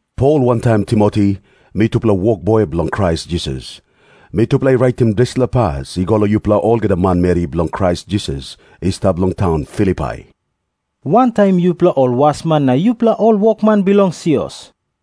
Pol wantaim Timoti, mitupela wokboi bilong Krais Jisas, mitupela i raitim dispela pas i go long yupela olgeta manmeri bilong Krais Jisas i stap long taun Filipai, wantaim yupela ol wasman na yupela ol wokman bilong sios.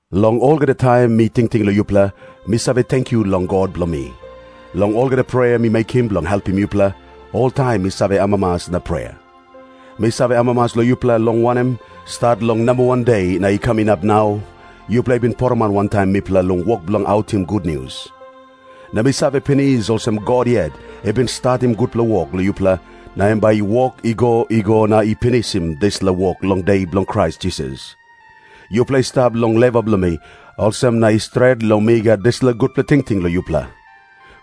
Long olgeta taim mi tingting long yupela, mi save tenkyu long God bilong mi. Long olgeta prea mi mekim bilong helpim yupela, oltaim mi save amamas na prea. Mi save amamas long yupela, long wanem, stat long namba wan de na i kam inap nau, yupela i bin poroman wantaim mipela long wok bilong autim gutnius. Na mi save pinis olsem, God yet i bin statim gutpela wok long yupela, na em bai i wok i go i go na i pinisim dispela wok long De bilong Krais Jisas. Yupela i stap long lewa bilong mi, olsem na i stret long mi gat dispela gutpela tingting long yupela.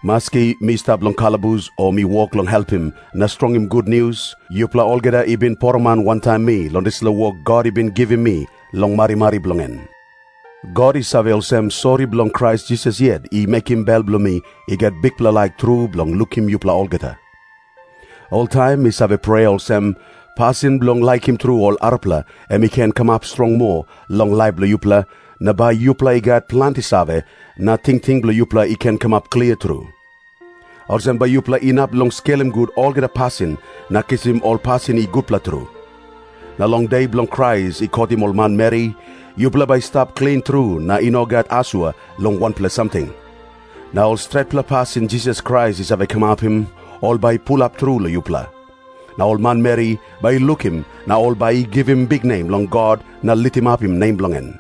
Maski mi stap long kalabus o mi wok long helpim na strongim gutnius, yupela olgeta i bin poroman wantaim mi long dispela wok God i bin givim mi long marimari bilong en. God i save olsem, sori bilong Krais Jisas yet i mekim bel bilong mi i gat bikpela laik tru bilong lukim yupela olgeta. Oltaim mi save prea olsem, pasin bilong laikim tru ol arapela em i ken kamap strong moa long laip bilong yupela, na bai yupela i gat planti save, na tingting bilong yupela i ken kamap klia tru. Olsem bai yupela inap long skelim gut olgeta pasin na kisim ol pasin i gutpela tru. Na long De bilong Krais i kotim ol manmeri, yupela bai i stap klin tru na i no gat asua long wanpela samting. Na ol stretpela pasin Jisas Krais i save kamapim, ol bai i pulap tru long yupela. Na ol manmeri bai i lukim na ol bai i givim biknem long God na litimapim nem bilong en.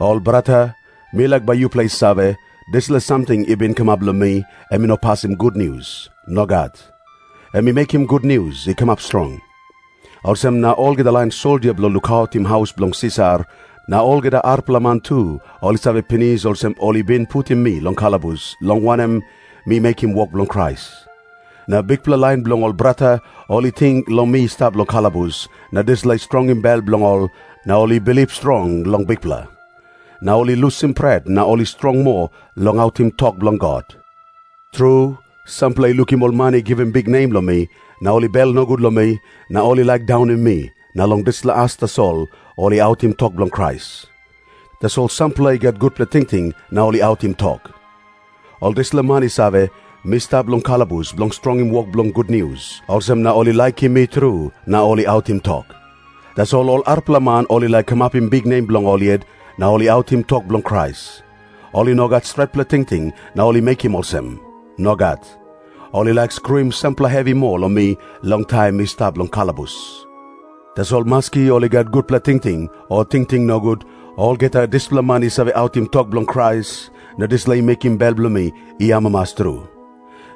Ol brata, mi laik bai yupela i save, dispela samting i bin kamap long mi em i no pasim gutnius. Nogat. Em i mekim gutnius i kamap strong. Olsem na olgeta lain soldia bilong lukautim haus bilong Sisar, na olgeta arapela man tu, ol i save pinis olsem ol i bin putim mi long kalabus, long wanem, mi mekim wok bilong Krais. Na bikpela lain bilong ol brata, ol i ting long mi stap long kalabus, na dispela i strongim bel bilong ol na ol i bilip strong long Bikpela. Na ol i lusim pret na ol i strong moa long autim tok bilong God. Tru, sampela i lukim ol man i givim biknem long mi, na ol i bel nogut long mi, na ol i laik daunim mi, na long dispela as tasol ol i autim tok bilong Krais. Tasol sampela i gat gutpela tingting na ol i autim tok. Ol dispela man i save, mi stap long kalabus bilong strongim wok bilong gutnius, olsem na ol i laikim mi tru na ol i autim tok. Tasol ol arapela man ol i laik kamapim biknem bilong ol yet, na ol i autim tok bilong Krais. Ol i no gat stretpela tingting na ol i mekim olsem. Nogat. Ol i laik skruim sampela hevi moa long mi long taim mi stap long kalabus. Tasol maski ol i gat gutpela tingting o tingting nogut, olgeta dispela man i save autim tok bilong Krais, na dispela i mekim bel bilong mi i amamas tru.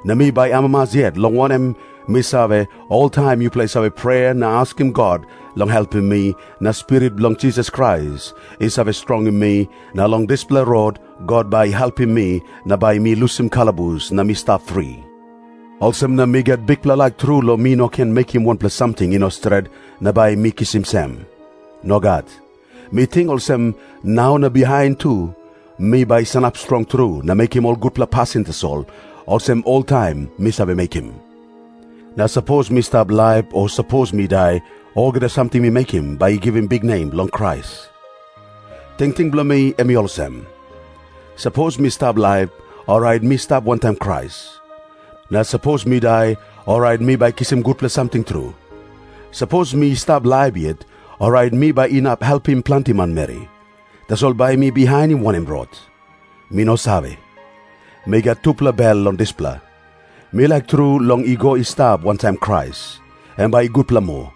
Na mi bai amamas yet, long wanem, mi save, oltaim yupela i save prea na askim God long helpim mi, na Spirit bilong Jisas Krais i save strongim mi, na long dispela rot God bai i helpim mi na bai mi lusim kalabus na mi stap fri. Olsem na mi gat bikpela laik tru long mi no ken mekim wanpela samting i no stret na bai mi kisim sem. Nogat. Mi ting olsem, nau na bihain tu mi bai sanap strong tru na mekim ol gutpela pasin tasol, olsem oltaim mi save mekim. Na maski sapos mi stap laip o sapos mi dai, olgeta samting mi mekim bai i givim biknem long Krais. Tingting bilong mi em i olsem. Sapos mi stap laip, orait mi stap wantaim Krais. Na sapos mi dai, orait mi bai kisim gutpela samting tru. Sapos mi stap laip yet, orait mi bai inap helpim planti manmeri. Tasol bai mi bihainim wanem rot? Mi no save. Mi gat tupela bel long dispela. Mi laik tru long i go i stap wantaim Krais. Em bai i gutpela moa.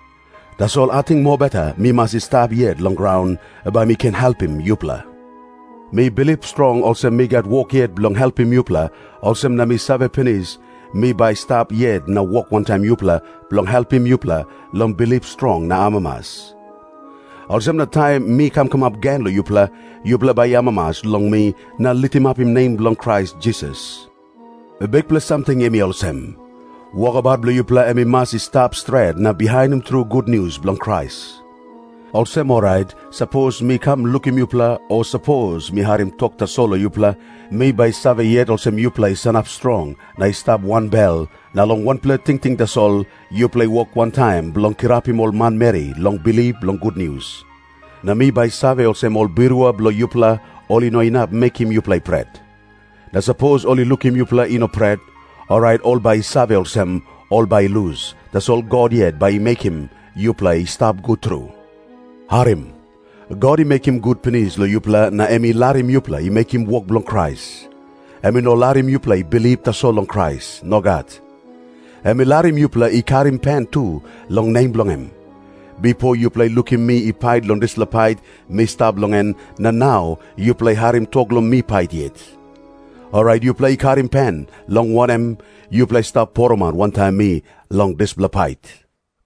Tasol ating mobeta mi mas i stap yet long graun, bai mi ken helpim yupela. Mi bilip strong olsem mi gat wok yet bilong helpim yupela, olsem na mi save pinis, mi bai stap yet na wok wantaim yupela bilong helpim yupela long bilip strong na amamas. Olsem na taim mi kam kamap gen long yupela, yupela bai i amamas long mi na litimapim nem bilong Krais Jisas. Bikpela samting, em i olsem. Wokabaut bilong yupela em i mas i stap stret na bihainim tru gutnius bilong Krais. Olsem orait maski sapos mi kam lukim yupela o mi harim tok tasol long yupela, mi bai save olsem yupela i sanap strong na i stap wanbel, na long wanpela tingting tasol yupela i wok wantaim bilong kirapim ol manmeri long bilip long gutnius. Na mi bai save olsem ol birua bilong yupela ol i no inap mekim yupela i pret. Na sapos ol i lukim yupela i no pret, orait ol bai i save olsem, ol bai i lus, tasol God yet bai i mekim yupela i stap gut tru. Harim. God i mekim gut pinis long yupela na em i larim yupela i mekim wok bilong Krais. Em i no larim yupela i bilip tasol long Krais. Nogat. Em i larim yupela i karim pen tu long nem bilong em. Bipo yupela i lukim mi i pait long dispela pait mi stap long en, na nau yupela i harim tok long mi pait yet. Orait yupela i karim pen, long wanem, yupela i stap poroman wantaim mi long dispela pait.